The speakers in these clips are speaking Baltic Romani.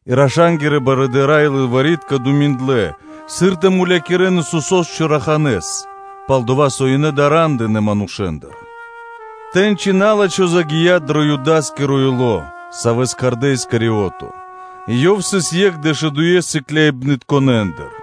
и раша́нгирэ барыдыра́ и лылвари́тка думиндлэ, сыр тэ мулякирэ́н Исусо́с чораханэ́с, пал-дова́ со ёнэ дара́ндынэ манушэ́ндыр. Тэ́ньци на́лачхо (сатана) загия́ дро Юда́скиро ило́, савэ́с кхардэ́ Искариото и ёв сыс екх дэшудуе́ сыкляибнытконэндыр.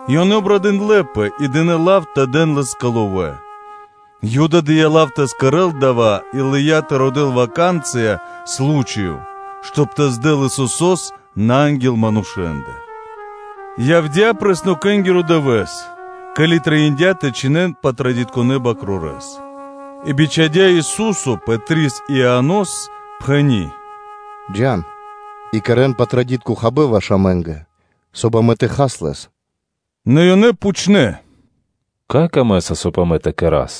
И ёнэ обрадындлэпэ и дынэ́ лав тэ дэн лэ́скэ ловэ́. Юда дыя́ лав тэ кэрэ́л дава́ и лыя́ тэ родэ́л лачхи́ ваканцыя (случаё), соб (кай) тэ здэл Исусо́с на анги́л манушэ́ндэ. Явдя́ Апреснокэнгиро Дывэ́с, ке́ли трэиндя́ тэ чхинэн Патрадитконэ бакрорэс (Патради́). И бичхадя́ Ису́со Пэтрис и Ианос, пхэни́: “Джа́н и кэрэ́н Патрадитко Хабэ́н ваш амэ́нгэ, соб (кай) амэ тэ хас лэс.” Нэ ёнэ пхучнэ́: “Кай камэ́са, соб (кай) амэ тэ кэра́с?”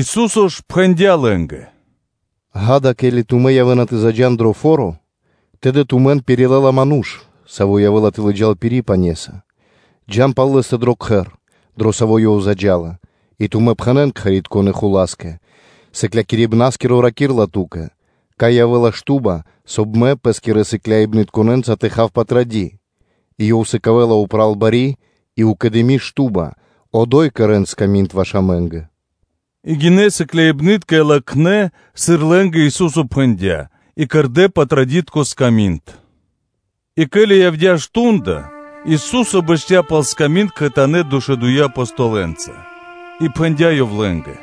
Ису́со ж пхэндя́ лэ́нгэ: “Ѓа́да, ке́ли тумэ́ явэ́на тэ заджа́н дро фо́ро, тэды тумэн пирилэла ману́ш, саво́ явэ́ла тэ лыджа́л пири́ пане́са; джа́н пал лэ́стэ дро кхэр, дро саво́ ёв заджа́ла, и тумэ́ пхэнэ́н кхэритконэ́ хула́скэ: ‘Сыклякирибна́скиро раки́рла ту́кэ: ‘Кай явэ́ла шту́ба, соб (кай) Мэ Пэ́скирэ сыкляибнытконэ́нца тэ хав Патради́?’ И ёв сыкавэ́ла упратуны бари шту́ба; одо́й кэрэ́н сками́нд ваш амэ́нгэ.’” И гинэ́ сыкляибны́тка и латхнэ́, сыр лэ́нгэ Ису́со пхэндя́ и кэрдэ́ Патрадитко Хабэ́н. И ке́ли явдя́ мардо́ (часо), Ису́со бэсця́ пал сками́нд кхэтанэ́ дэшудуе́ Апостолэнца. И пхэндя́ Ёв лэ́нгэ: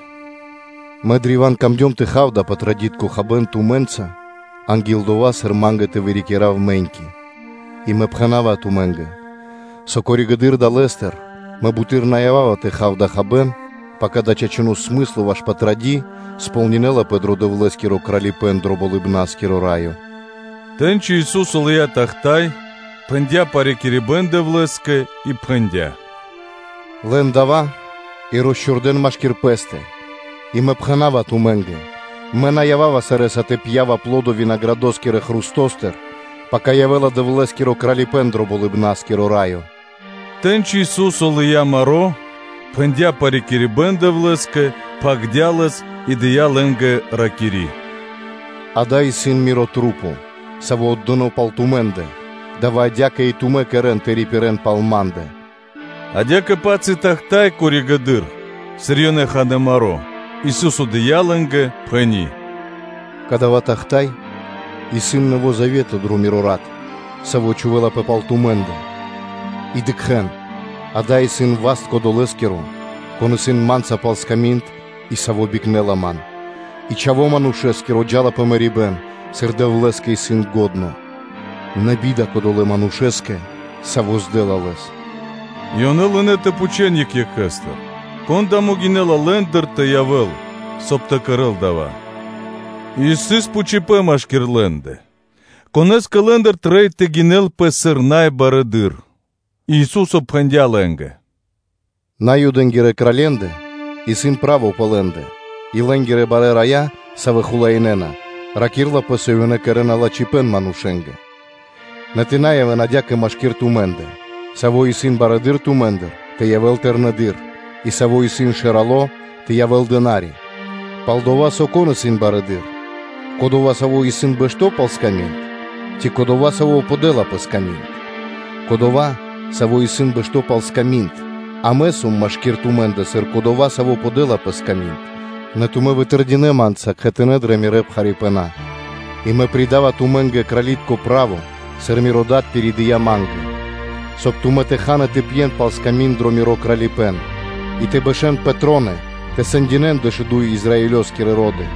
“Мэ древа́н камдём тэ хав дава́ Патрадитко Хабэ́н тумэ́нца анги́л дова́, сыр Ма́нгэ тэ вырикирав мэ́ньки. И Мэ пхэна́ва тумэ́нгэ, со коригэды́р (позжэды́р) далэ́стыр Мэ буты́р на ява́ва тэ хав дава́ хабэ́н, пака дава́ чачуно́ смысло ваш Патради́ кэрэ́лапэ кэ ко́нцо / яго́ро (сполнинэлапэ) дро Дэвлэ́скиро Кралипэ́н дро Болыбна́скиро Раё.” Тэ́ньци Ису́со лыя́ тахта́й, пхэндя́ парикирибэн Дэвлэ́скэ и пхэндя́: “Лэн дава́ и росчхувэн машки́р пэ́стэ. И Мэ пхэна́ва тумэ́нгэ: Мэ на ява́ва сарэ́са тэ пья́в аплодо винаградоскирэ хрустостыр, пака явэ́ла Дэвлэ́скиро Кралипэ́н дро Болыбна́скиро Раё.” Тэ́ньци Ису́со лыя́ маро́, парикирдя Дэвлэ́с (Дэвлэ́скэ), пхагирдя́ лэс, и дыя́ лэ́нгэ; ракири́: ‘Ѓа́да, исын Мирэ́ Маса́, савэ́ отдэнапэ пал тумэ́ндэ; дава́ адя́кэ и тумэ́ кэрэ́н тэ рипирэ́н пал Ма́ндэ.” Адя́кэ-паць и тахта́й (чаша) коригэды́р, сыр ёнэ ханэ́ маро́, Ису́со дыя́ лэ́нгэ, пхэни́: “Кадава́ тахта́й исын нэво́ завето дро Миро рат, саво́ чхувэ́лапэ пал тумэ́ндэ. И дыкхэ́н: ада́й исын васт кодолэскиро, кон исын Ма́нца пал сками́нд, и саво́ бикнэла Ман; и Чхаво́ Манушэ́скиро джа́ла пэ мэрибэ́н, сыр Дэвлэ́скэ исын лачхо́, нэ би́да кодолэ́ манушэ́скэ, саво́ здэла Лэс.” И ёнэ лынэ́ тэ допхучэн екх екхэстыр, кон дава́ могинэ́ла лэ́ндыр тэ явэ́л, соб (кай) тэ кэрэ́л дава́. И сыс пхучибэн машки́р лэ́ндэ, конэ́скэ лэ́ндыр трэй тэ гинэлпэ сыр най барэды́р. И Ису́со пхэндя́ лэ́нгэ: “Наюдэнгирэ кралье́ндэ исын право пэ лэ́ндэ, и лэ́нгирэ барэ́ рая, савэ́ хулаинэна, ракирэ́на, со ёнэ кэрэ́на лачхипэ́н манушэ́нгэ. Нэ тэ на явэ́н адя́кэ машки́р тумэ́ндэ: саво́ исын барэды́р тумэ́ндыр, тэ явэ́л тэрнэдыр; и саво́ исын шэрало́, тэ явэ́л дына́ри (слуга). Пал-дова́ со, кон исын барэды́р; кодова́, саво́ исын бэшто́ пал сками́нд, ци кодова́, саво́ подэла пэ сками́нд? Кодова́, саво́ исын бэшто́ пал сками́нд. А Мэ сом машки́р тумэ́ндэ, сыр кодова́, саво́ подэла пэ сками́нд. Нэ тумэ́ вытэрдинэ Ма́нца кхэтанэ́ дрэ Мирэ́ пхарипэна. И Мэ пиридава тумэ́нгэ крали́тко право, сыр Миро Дад пиридыя ма́нгэ, соб (кай) тумэ́ тэ хан и тэ пьен пал сками́нд дро Миро Кралипэ́н, и тэ бэшэ́н пэ троны тэ сэндинэ́н дэшуду́й Израилёскирэ ро́ды.”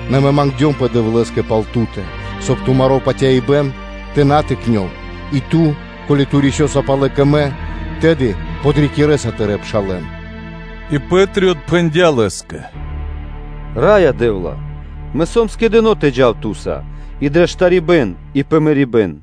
нэ Мэ мангдёмпэ Дэвлэ́скэ пал ту́тэ, соб (кай) тыро́ патяибэ́н тэ на тыкнёл, и ту, ке́ли рисёса палэ кэ Мэ, тэды подрикирэса тырэ́ пшалэ́н.” И Пэ́три отпхэндя́ Лэ́скэ: “Раё Дэ́вла! Мэ сом скэдыно́ тэ джав Ту́са и дрэ штарибэ́н, и пэ мэрибэ́н.”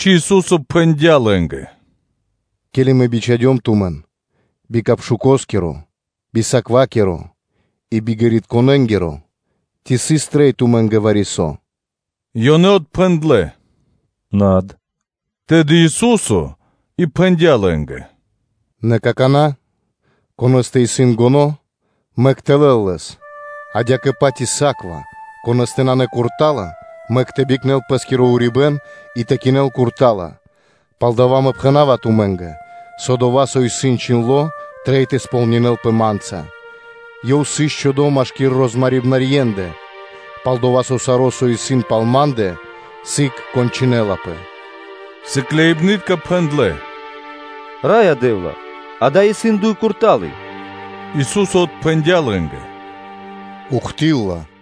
Тэ́ньци Ису́со пхэндя́ лэ́нгэ: “Ке́ли Мэ бичхадём тумэн би муе́нгиро (капшукоскиро), би саквакиро и би ґэритконэнгиро, ци сыс трэй тумэ́нгэ вари-со?” Ёнэ отпхэндлэ́: “Над.” Тэды Ису́со и пхэндя́ лэ́нгэ: “Нэ какана́ конэ́стэ исын муенгиро (капшуко), мэк тэ лэл лэс: адя́кэ-паць и саква, конэ́стэ нанэ курта́ла, мэк тэ бикнэл пэ́скиро урибэ́н и тэ кинэл курта́ла, палдава́ Мэ пхэна́ва тумэ́нгэ, со дова́, со исын чхиндло́, трэй тэ сполнинэ́лпэ Ма́нца: “Ёв сыс чхудо машки́р розмарибнарьендэ”: пал-дова́ со саро́, со исын пал Ма́ндэ, сыг кончынэлапэ.” Сыкляибны́тка пхэндлэ́: “Раё Дэ́вла! Ада́й исын дуй курталы (сабли).” Ису́со отпхэндя́ лэ́нгэ: “Ухты́лла (до́си).”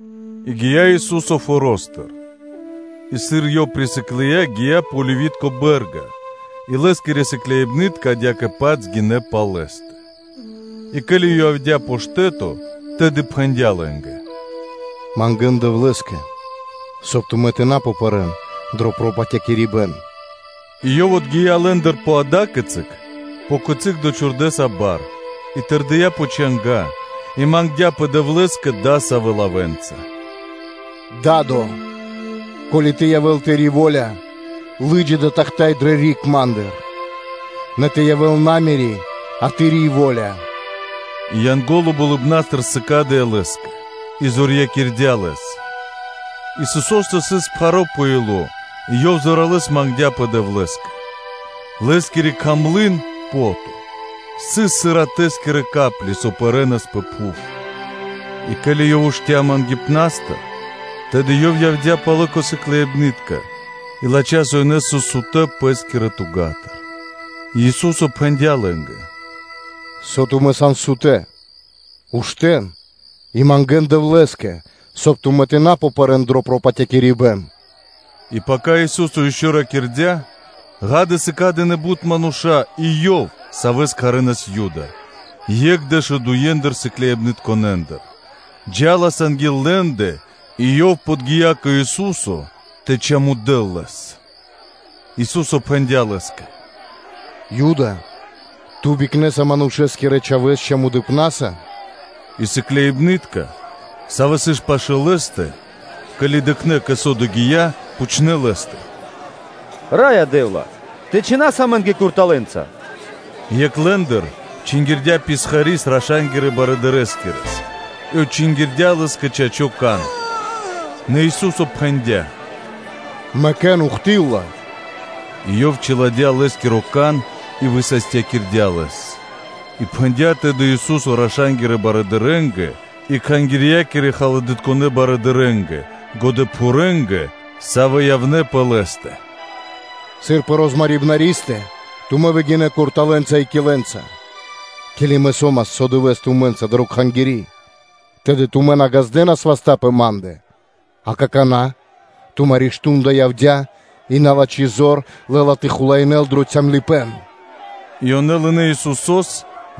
И гия́ Ису́со форо́стыр и сыр Ёв присыклыя, гия́ пэ Оливи́тко бэ́рга, и Лэ́скирэ сыкляибны́тка адя́кэ-паць гинэ́ пал Лэ́стэ. И ке́ли Ёв явдя́ пэ штэ́то, тэды пхэндя́ лэ́нгэ: “Мангэ́нпэ Дэвлэ́скэ, соб (кай) тумэ́ тэ на пэрэ́н дро пропатякирибэн.” И Ёв отгия́ лэ́ндыр пэ ада́кицы, пэ кицы́ дочхурдэса бар, и тэрдия́ пэ чанга́, и мангдя́пэ Дэвлэ́скэ дасавэ́ лавэ́нца: “Да́до! Ко́ли тэ явэ́л Тыри́ во́ля, лы́джа дава́ тахта́й дрэ риг Ма́ндыр; – нэ тэ явэ́л на Мири́, а Тыри́ во́ля.” И Янго́ло болыбна́стыр сыкадыя́ Лэ́скэ и зорьякирдя Лэс. Исусо́стэ сыс пхаро́ пэ ило́ и Ёв зоралэ́с мангдя́пэ Дэвлэ́скэ. Лэ́скири кхамлын (пото) сыс, сыр ратэскирэ капли (чолыня), со пэрэнас пэ пхув И ке́ли Ёв уштыя́ мангипнастыр, тэды Ёв явдя́ палэ кэ сыкляибны́тка; и латхя́, со ёнэ сыс сутэ́ пэ́скирэ тугатыр И пхэндя́ Ису́со лэ́нгэ: “Со тумэ́ сан сутэ́? Уштэ́н и мангэ́нпэ Дэвлэ́скэ, соб (кай) тумэ́ тэ на пэрэ́н дро пропатякирибэн.” И ке́ли Ису́со ишчо (инкэ́) ракирдя́, ґа́да, сыкадынэ бут мануша́, и акэ, ёв, савэ́с кхардэ́ Юда, екх дэшудуедыр сыкляибнытконэндыр, джа́лас анги́л лэ́ндэ, и ёв подги́я кэ Ису́со тэ чамудэл Лэс. Ису́со пхэндя́ Лэ́скэ: “Ю́дэ! Ту бикнэса Манушэ́скирэ Чхавэ́с чамудыпнаса?” И сыкляибны́тка, савэ́ сыс пашы́л Лэ́стэ, ке́ли дыкхнэ́, кэ со дава́ догия́, пхучнэ́ Лэ́стыр: “Раё Дэ́вла! Тэ чхинас амэ́нгэ курталэнца?” И екх лэ́ндыр чингирдя писхари́с раша́нгирэ барыдырэскирэс и отчингирдя лэ́скэ чачо́ (право) кан. Нэ Ису́со пхэндя́: “Мэкэ́н, ухты́лла (до́си)!”, – и Ёв чиладя́ лэ́скиро кан и высастякирдя́ лэс. И пхэндя́ тэды Ису́со раша́нгирэ барыдырэ́нгэ и кхангирья́кирэ-халадытконэ барыдырэ́нгэ, годэпхурэнгэ, савэ́ явнэ́ пэ Лэ́стэ: “Сыр пэ розмарибнаристэ тумэ́ выгинэ́ курталэнца и килэнца (конкэнца)? Ке́ли Мэ со́мас со дывэ́с тумэ́нца дрэ Кхангири́, тэды тумэ́ наґаздынэ васта́ пэ Ма́ндэ; а какана́ – тумаро́ мардо́ (шту́нда) явдя́ и налачхи зор лэ́ла тэ хулаинэ́л дро калыпэ́н (цямлыпэ́н).” И ёнэ лынэ́ Исусо́с,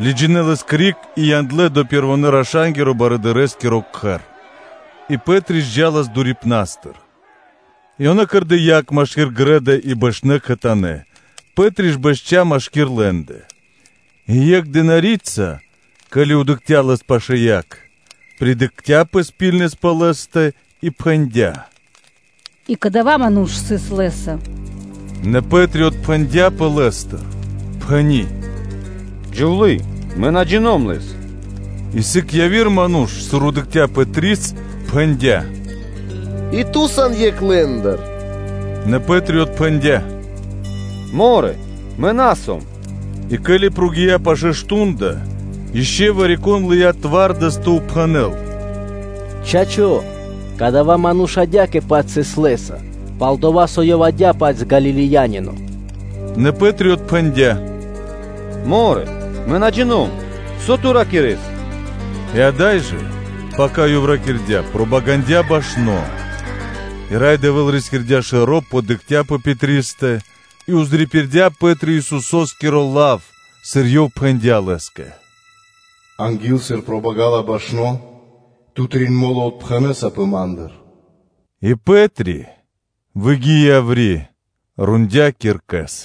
лыджинэ́ лэс криг и яндлэ́ дро пэрвонэ́-раша́нгирэ барыдырэскиро кхэр. И Пэ́три ж джа́лас дурипнастыр. И ёнэ кэрдэ́ яг машки́р грэ́да (дво́ро) и бэшнэ́ кхэтанэ́; Пэ́три ж бэсця́ машки́р лэ́ндэ. И екх дына́рица, ке́ли дыкхця́ лэс пашы́л яг, придыкхцяпэ ракхунэс пэ лэ́стэ и пхэндя́: “И кадава́ ману́ш сыс Лэ́са.” Нэ Пэ́три отпхэндяпэ Лэ́стыр, пхэни́: “Джувлие, мэ на джино́м Лэс.” И сыг яви́р ману́ш, сыр дыкхця́ Пэтрис, пхэндя́: “И ту сан екх лэ́ндыр.” Нэ Пэ́три отпхэндя́: “Морэ, мэ на сом.” И ке́ли прогия́ (накхця) пашэ́ мардо́, ишчо (инкэ́) вари-кон лыя́ зорья́са тэ допхэнэл: “Чачо́, кадава́ ману́ш адя́кэ-паць сыс Лэ́са, пал-дова́ со ёв исын адя́кэ-паць Галилеянино.” Нэ Пэ́три отпхэндя́: “Морэ, мэ на джино́м, со ту ракирэ́са.” И ада́й жэ, пака ёв ракирдя́, пробагандя башно. И Рай Дэвэ́л рискирдя́ шэро́, подыкхця́ пэ Пэтристэ; и пририпирдя Пэ́три Исусо́скиро лав, сыр Ёв пхэндя́ Лэ́скэ: “Анги́л, сыр пробагала башно, ту трин мо́лы отпхэнэсапэ Ма́ндыр.” И Пэ́три, выгии яври́, рондя́ киркэс.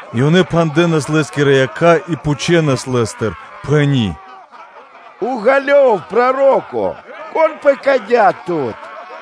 и ёнэ пхандэнас Лэ́скирэ якха́, пхучнэ́ Лэ́стыр, пхэни́: “Уґалёв, проро́ко, кон пэкадя́ Тут?”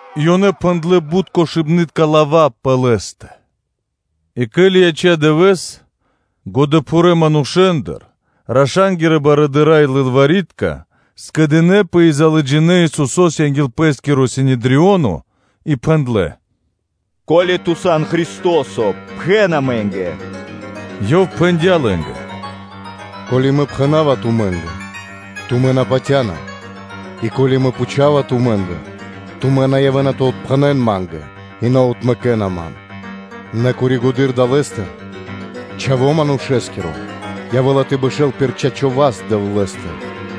И ёнэ пхэндлэ́ бут кошыбнытка лава́ пэ Лэ́стэ. И ке́ли яця́ дывэ́с, годэпхурэ́ манушэ́ндыр, раша́нгирэ барыдыра́ и лылвари́тка скэдынэ́пэ, и лыджинэ́ Исусо́с анги́л пэ́скиро Синедрионо и пхэндлэ́: “Ко́ли Ту сан Христо́со, пхэн амэ́нгэ.” Ёв пхэндя́ лэ́нгэ: “Ко́ли Мэ пхэна́ва тумэ́нгэ, тумэ́ на патя́на; и ко́ли Мэ пхучава тумэ́ндыр, тумэ́ на явэ́на тэ отпхэнэн Ма́нгэ, и на отмэкэна Ман; нэ коригэды́р далэ́стыр Чхаво́ Манушэ́скиро явэ́ла тэ бэшэ́л пир чачо́ васт Дэвлэ́стыр.”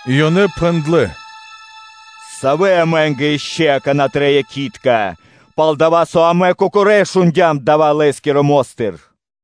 И ёнэ пхэндлэ́: “Савэ амэ́нгэ ишчо (инкэ́) акана́ трэй якхи́тка, пал-дова́ со амэ кокорэ́ шундя́м дава́ Лэ́скирэ мо́стыр?”